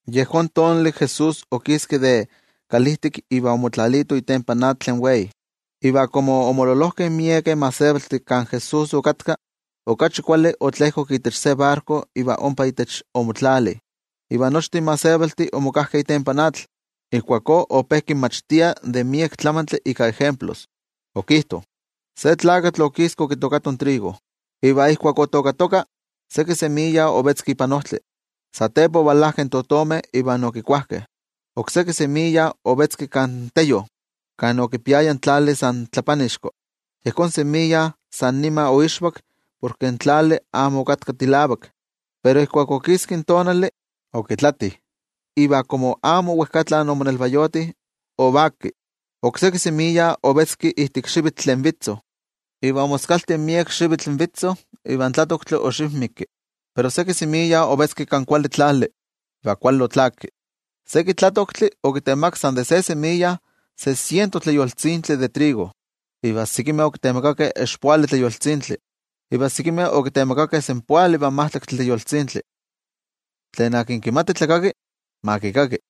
Yejón tonali Jesús okiski de kalijtik iva omotlalito itempan atl tlen wei. Iva komo omololojkeh miekeh gentejtih kan Jesús okatka, mejor otlejkok itech se barko iva ompa itech omotlali, iva nochtin gentejtih omokajkeh itempan atl. Ijkuakó ope kinmachtia de miek tlamantli ika ejemplos. Okijto: —Se tlakatl okiski okitookato trigo. Iva ijkuak otookatoka, seki semiya ovetzki ipan ojtli. Satepa ovalajkeh in totomeh iva okikuajkeh. Okseki semiya ovetzki kan teyo, kan okipiaya tlali san tlapanixko. Yejón semiya san nima oixvak porke in tlali amo okatka tilavak. Pero ijkuak okiski in tonali, okitlati, iva komo amo wejkatla omonelvayoti, ovaki. Okseki semiya ovetzki ijtik xivyo tlen vitzo, iva omoskalti miek xivitl vitzo iva in tlatoktli oxivmiki. Pero seki semiya ovetzki kan kuali tlali, iva kuali otlaki. Seki tlatoktli okitemakak san de se semiya se siento tleyoltzintli de trigo. Iva sekimeh okitemakakeh expoali tleyoltzintli, iva sekimeh okitemakakeh senpoali ivan majtlaktli tleyoltzintli. Tlen kimati tlakaki, ma kikaki.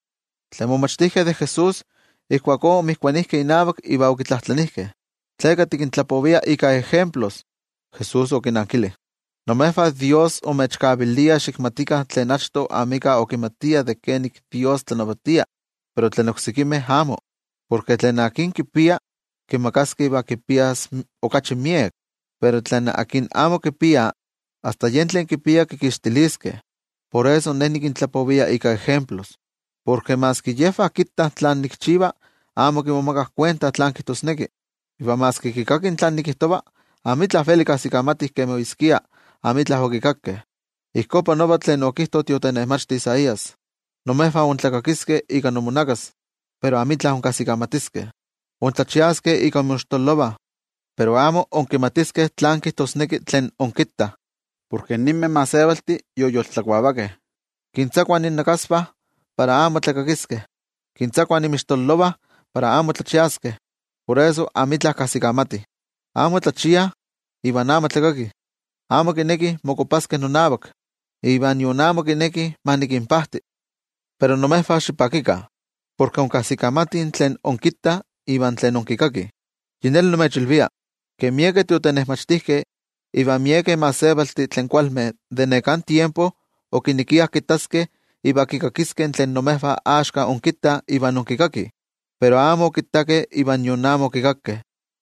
Tlen momachtijkeh de Jesús ijkuakó omotokijkeh inavak iva okitlajtlanijkeh: —¿Tleka tikintlapovia ika ejemplos? Jesús okinnankili: —Imejvah Dios imechkavilia xikmatikah tlen achto amika okimatia de kenik in Dios tlanavatia, pero tlen oksekimeh amo. Porke tlen kipia, kimakaskeh iva kipias okachi miek. Pero tlen amo kipia, asta yen tlen kipia kikixtiliskeh. Por eso Ne nikintlapovia ika ejemplos, porke maski yejvah kittah tlen nikchiva amo kimomakah kuenta tlán kijtosneki. Iva maski kikakih tlen nikijtova amitla veli kajsikamatih kemi oyeskia amitla okikakkeh. Ijkó panolo tlen okijto in tiotenejmachti Isaías: Imejvah intlakakiskeh ika inmonakas, pero amitla inkajsikamatiskeh. Intlachiaskeh ika inmoixtololovah, pero amo inkimatiskeh tlán kijtosneki tlen inkittah. Porke ninmeh gentejtih yoyoltlakuavakeh. Kintzakuah innakasvah para amo tlakakiskeh, kintzakuah inmixtololovah para amo tlachiaskeh. Por eso amitla kajsikamatih, amo tlachiah iva amo tlakakih. Amo kinekih mokopaskeh nonavak, iva nion amo kinekih ma nikinpajti. ’Pero imejvah xipakikah, porke inkajsikamatih tlen inkittah iva tlen inkikakih. Yi neli nimechilvia, ke miekeh tiotenejmachtijkeh iva miekeh gentejtih tlen kualmeh de neká tiempo okinekiah kittaskeh iva kikakiskeh tlen imejvah axka inkittah iva inkikakih, pero amo okittakeh iva nion amo okikakkeh.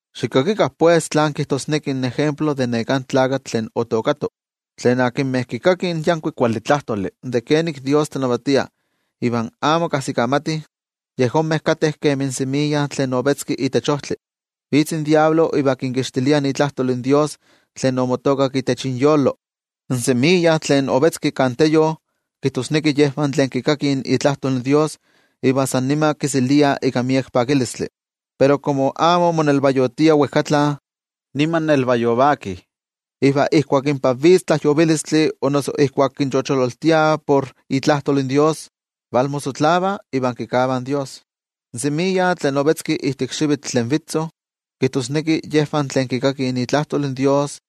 ’Xikakikah pues tlán kijtosneki in ejemplo de neká tlakatl tlen otookato. Tlen akinmeh kikakih in yankuik kuali tlajtoli de kenik Dios tlanavatia iva amo kajsikamatih, yejonmeh kateh kemi in semiya tlen ovetzki itech ojtli, vitz in Amo Kuali Tlakatl iva kinkixtilia itlajtol in Dios tlen omotookak itech inyolo. In semiya tlen ovetzki kan teyo, kijtosneki yejvah tlen kikakih itlajtol in Dios iva san nima kiseliah ika miek pakilistli. Pero komo amo monelvayotiah wejkatla, nima nelvayovakih. Iva ijkuak inpa vitz tlajyovilistli o noso ijkuak kinchochololtiah por itlajtol in Dios, valmoxijxikovah iva kikavah in Dios. In semiya tlen ovetzki ijtik xivyo tlen vitzo, kijtosneki yejvah tlen kikakih itlajtol Dios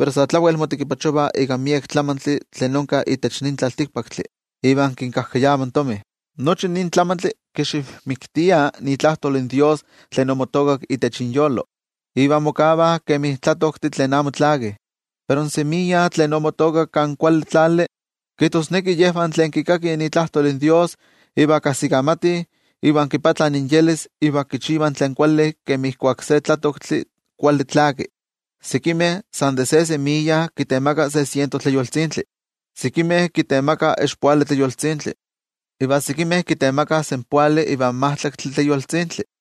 pero sa tlawel motekipachovah ika miek tlamantli tlen onka itech nin tlaltikpaktli iva kinmixkajkayava in tomi. Nochi nin tlamantli kixivmiktia itlajtol in Dios tlen omotookak itech inyolo, iva mokavah kemi tlatoktih tlen amo tlakih. Pero in semiya tlen omotookak kan kuali tlali, kijtosneki yejvah tlen kikakih itlajtol in Dios iva kajsikamatih, iva moyolkuapah iva kichivah tlen kuali kemi ijkuak se tlatoktli kuali tlaki. Sekimeh san de se semiya kitemakah se siento tleyoltzintli, sekimeh kitemakah expoali tleyoltzintli, iva sekimeh kitemakah senpoali ivan majtlaktli tleyoltzintli.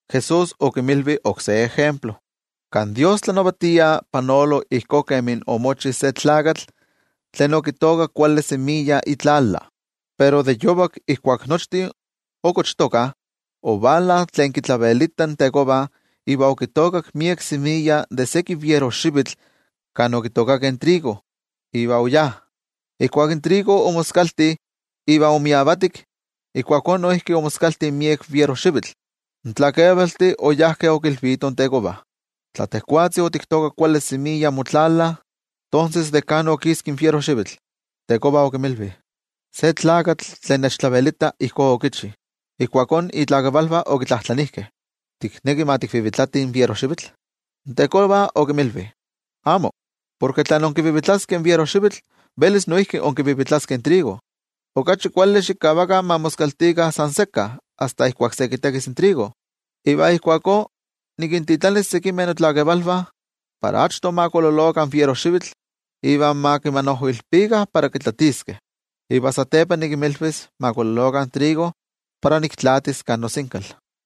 Jesús okinmilvi oksé ejemplo: —Kan Dios tlanavatia panolo ijkó kemi omochi se tlakatl tlen okitookak kuali semiya itlala. Pero de yovak ijkuak nochtin okochtokah, ovala tlen kitlavelita in tekova iva okitookak miek semiya de seki fierojxivitl kan okitookakeh trigo, iva oyá. Ijkuak in trigo omoskalti iva omiavatik, ijkuakó noijki omoskalti miek fierojxivitl. In tlakevaltih oyajkeh okilvitoh in tekova: “Tla tejwatzi otiktookak kuali semiya motlala, ¿tonses de kan okiski in fierojxivitl?” In tekova okinmilvi: “Se tlakatl tlen nechtlavelita ijkó okichi.” Ijkuakó itlakevalvah okitlajtlanijkeh: “¿Tikneki ma tikvivitlatih in fierojxivitl?” In tekova okinmilvi: “Amo, porke tla inkivivitlaskeh in fierojxivitl, velis noijki inkivivitlaskeh in trigo. Okachi kuali xikavakah ma moskaltikah san sekka asta ijkuak se kitekis in trigo. Iva ijkuakó nikintitlanis sekimeh notlakevalvah para achto ma kololokah in fierojxivitl iva ma kimanojoilpikah para kitlatiskeh. Iva satepa nikinmilvis ma kololokah in trigo para niktlaatis kan nosinkal.”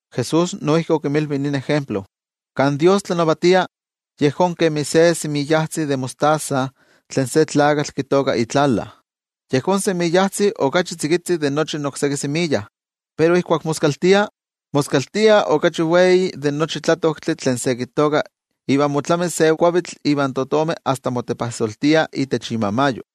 Jesús noijki okinmilvi nin ejemplo: —Kan Dios tlanavatia yejón kemi se semiyajtzi de mostaza tlen se tlakatl kitooka itlala. Yejón semiyajtzi okachi tzikitzi de nochi okseki semiya, pero ijkuak moskaltia, moskaltia okachi wei de nochi tlatoktli tlen se kitooka iva motlami se kuavitl iva in totomeh asta motepajsoltiah itech imamayo.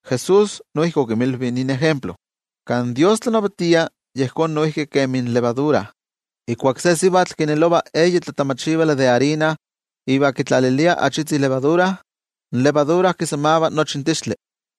Jesús noijki okinmilvi nin ejemplo: —Kan Dios tlanavatia yejón noijki kemi in xokotixtli. Ijkuak se sivatl kinelova eyi tlatamachivali de arina iva kitlalilia achitzi xokotixtli, in xokotixtli kisamava nochi in tixtli.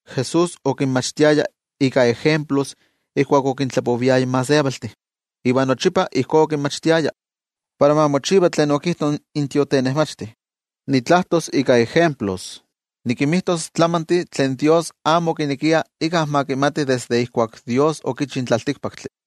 Jesús okinmachtiaya ika ejemplos ijkuak okintlapoviaya in gentejtih. Iva nochipa ijkó okinmachtiaya. Para ma mochiva tlen okijto in tiotenejmachti: Nitlajtos ika ejemplos, nikinmijtos tlamantih tlen Dios amo okinekia íkka ma kimati desde ijkuak Dios okichi in tlaltikpaktli.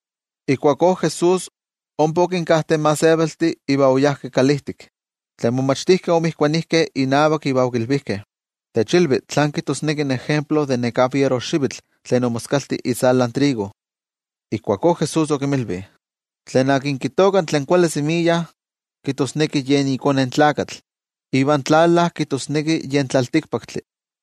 Ijkuakó Jesús ompa okinkajte in gentejtih iva oyá kalijtik. Tlen momachtijkeh omotokijkeh inavak iva okilvijkeh: —Techilvi tlan kijtosneki in ejemplo de neká fierojxivitl tlen omoskalti itzalan trigo. Ijkuakó Jesús okinmilvi: —Tlen kitooka tlen kuali semiya, kijtosneki yen iKone in Tlakatl. Ivan tlala kijtosneki yen tlaltikpaktli.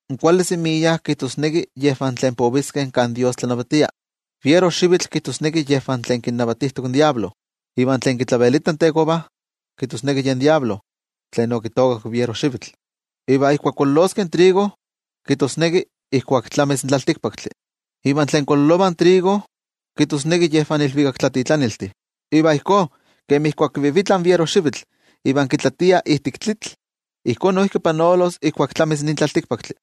In kuali semiya kijtosneki yejvah tlen poviskeh kan Dios tlanavatia. Iva in fierojxivitl kijtosneki yejvah tlen kinnavatijtok in Amo Kuali Tlakatl. Iva tlen kitlavelita in tekova, kijtosneki yen Amo Kuali Tlakatl tlen okitookak in fierojxivitl. Iva ijkuak kololoskeh in trigo, kijtosneki ijkuak tlamis in tlaltikpaktli. Iva tlen kololovah in trigo, kijtosneki yejvah in ilvikaktlatitlaniltih. Iva ijkó kemi ijkuak kivivitlah in fierojxivitl iva kitlatiah ijtik tlitl, ijkó noijki panolos ijkuak tlamis nin tlaltikpaktli.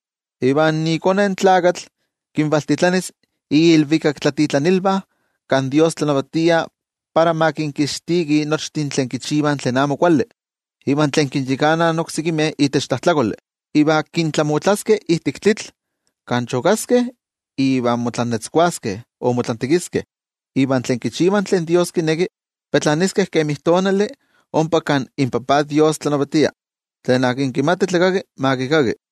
Iva iKone in Tlakatl kinvalintitlanis iilvikaktlatitlanilvah kan Dios tlanavatia para ma kinkixtikih nochtin tlen kichivah tlen amo kuali iva tlen kinyakanah oksekimeh itech tlajtlakoli. Iva kintlamotlaskeh ijtik tlitl kan chokaskeh iva motlantekiskeh. Iva tlen tlakamelajkeh, petlaniskeh kemi tonali ompa kan inTajtzi Dios tlanavatia. Tlen kimati tlakaki, ma kikaki.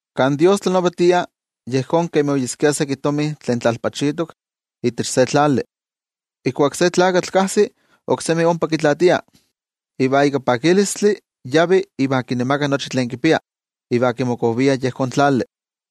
’Kan Dios tlanavatia yejón kemi oyeskia seki tomi tlen tlalpachitok itech se tlali. Ijkuak se tlakatl kajsi, oksemi ompa kitlaatia. Iva ika pakilistli yavi iva kinemaka nochi tlen kipia. Iva kimokovia yejón tlali.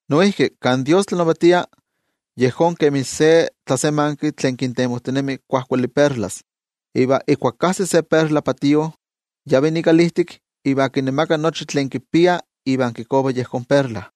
’Noijki kan Dios tlanavatia, yejón kemi se tlasemanki tlen kintemojtinemi kuajkuali perlas, iva ijkuak kajsi se perla patío, yavi ikalijtik iva kinemaka nochi tlen kipia iva kikova yejón perla.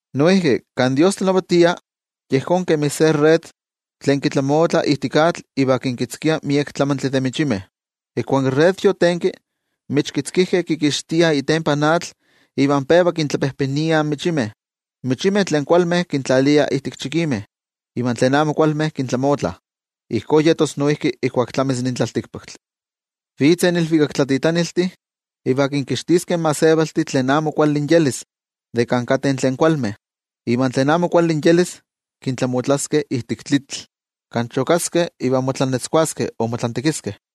’Noijki kan Dios tlanavatia, yejón kemi se red tlen kitlamotlah ijtik atl iva kinkitzkia miek tlamantli de michimeh. Ijkuak in red yotenki, in michkitzkijkeh kikixtiah itempan atl iva peva kintlapejpeniah in michimeh. In michimeh tlen kualmeh kintlaliah ijtik chikimeh, iva tlen amo kualmeh kintlamotlah. Ijkó yetos noijki ijkuak tlamis nin tlaltikpaktli. Vitzeh in ilvikaktlatitlaniltih iva kinkixtiskeh in gentejtih tlen amo kuali inyelis de kan kateh tlen kualmeh. Iva tlen amo kuali inyelis kintlamotlaskeh ijtik tlitl, kan chokaskeh iva motlantekiskeh.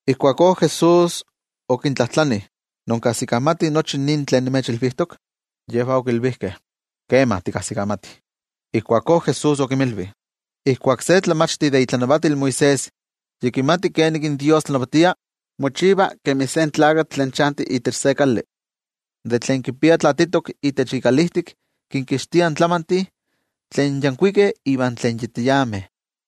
Ijkuakó Jesús okintlajtlani: —¿Inkajsikamatih nochi nin tlen nimechilvijtok? Yejvah okilvijkeh: —Kema, tikajsikamatih. Ijkuakó Jesús okinmilvi: —Ijkuak se tlamachti de itlanavatil Moisés yi kimati kenik in Dios tlanavatia, mochiva kemi se tlakatl tlen chanti itech se kali. De tlen kipia tlaatitok itech ikalijtik kinkixtia tlamantih tlen yankuikeh iva tlen yi tiameh.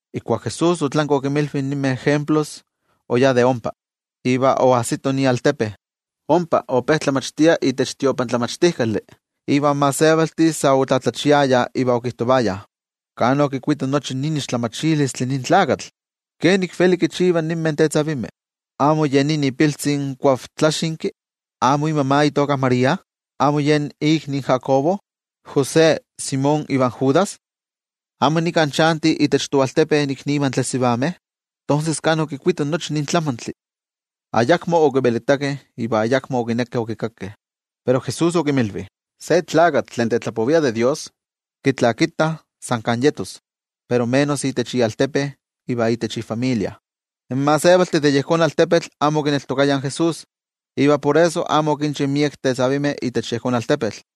Ijkuak Jesús otlanki okinmilvi ninmeh ejemplos oyá de ompa iva oajsito ialtepe. Ompa ope tlamachtia itech tiotlamachtijkali, iva in gentejtih sa otlatlachiayah iva okijtovayah: —¿Kan okikuito nochi nin tlamatilistli nin tlakatl? ¿Kenik veli kinchiva ninmeh tetzavimeh? ¿Amo ye nin ipiltzi in kuavtlaxinki? ¿Amo imama itoka María? ¿Amo yen inmikni in Jacobo, José, Simón ivan Judas? ¿Amo nika chantih itech toaltepe iknivah tlen sivameh? ¿Tonses kan okikuito nochi nin tlamantli? Ayakmo okivelitakeh iva ayakmo okinekeh okikakkeh. Pero Jesús okinmilvi: —Se tlakatl tlen tetlapovia de Dios kitlakitah san kan yetos, pero menos itech ialtepe iva itech ifamilia. In gentejtih de yejón altepetl amo okineltokayah in Jesús, iva por eso amo okinchi miekeh tetzavimeh itech yejón altepetl.